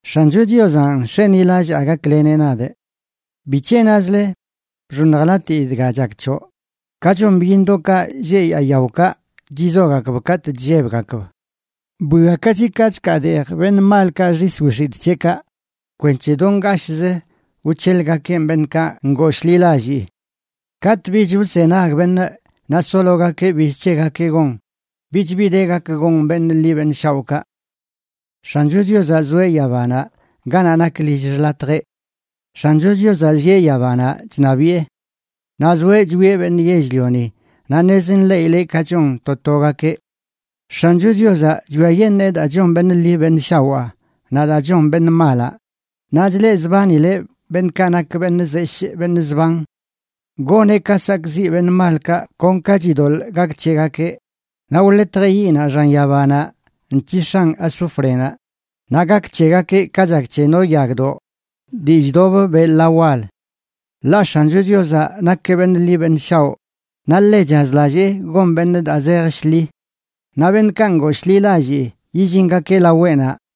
X̱ancho Chiozanꞌ nx̱enilallaa gakleneꞌ nadꞌ. ¿Bic̱he nazle: “Bxoṉjlatii dga chak c̱hoꞌ, ka chon byiṉdoꞌkaꞌ lleꞌ yaa yaokaꞌ chizogakb katꞌ chllebgakb? Bwiakachi ka chkaadeej beṉꞌ malkaꞌ xis wix̱itꞌ c̱heꞌkaꞌ, kwenc̱he do ngashꞌzə wc̱helꞌgakeꞌn beṉꞌkaꞌ ngooshḻilallii. Katꞌ bich wzenag beṉꞌ naꞌ sologakeꞌ biz c̱hegakeꞌ gon, bich bi de gak gon beṉꞌ ḻi beṉꞌ shaoꞌkaꞌ.” X̱ancho Chiozaꞌ zoeꞌ yabanaꞌ ganaꞌ nak lill xḻatjeꞌ. X̱ancho Chiozaꞌ llieꞌ yabanaꞌ chṉabiꞌe. Naꞌ zoeꞌ chwieꞌ beṉꞌ yell-lioni naꞌ ṉez nḻeꞌileꞌ ka chon to togakeꞌ. X̱ancho Chiozaꞌ chwiayeṉee daa chon beṉꞌ ḻi beṉꞌ shawaa naꞌ daa chon beṉꞌ malaꞌ; naꞌ chleꞌzbanileꞌ beṉꞌkaꞌ nak beṉꞌ zeshꞌ beṉꞌ zban. Goneꞌ ka sakꞌziꞌ beṉꞌ malkaꞌ kon ka chidoḻꞌ gak c̱hegakeꞌ. Naꞌ wḻetjeꞌ yiꞌnaꞌ xan yabanaꞌ nc̱hix̱an azúfrenaꞌ, naꞌ gak c̱hegakeꞌ ka chak c̱he no yagdoꞌ dii chdobə beꞌ ḻa wal. Ḻaꞌ X̱ancho Chiozaꞌ nakeꞌ beṉꞌ ḻi beṉꞌ shaoꞌ, naꞌ ḻe chazlallee gon beṉꞌ daa zej shḻi. Naꞌ beṉꞌkaꞌ ngooshḻilallii yillingakeꞌ laweꞌnaꞌ.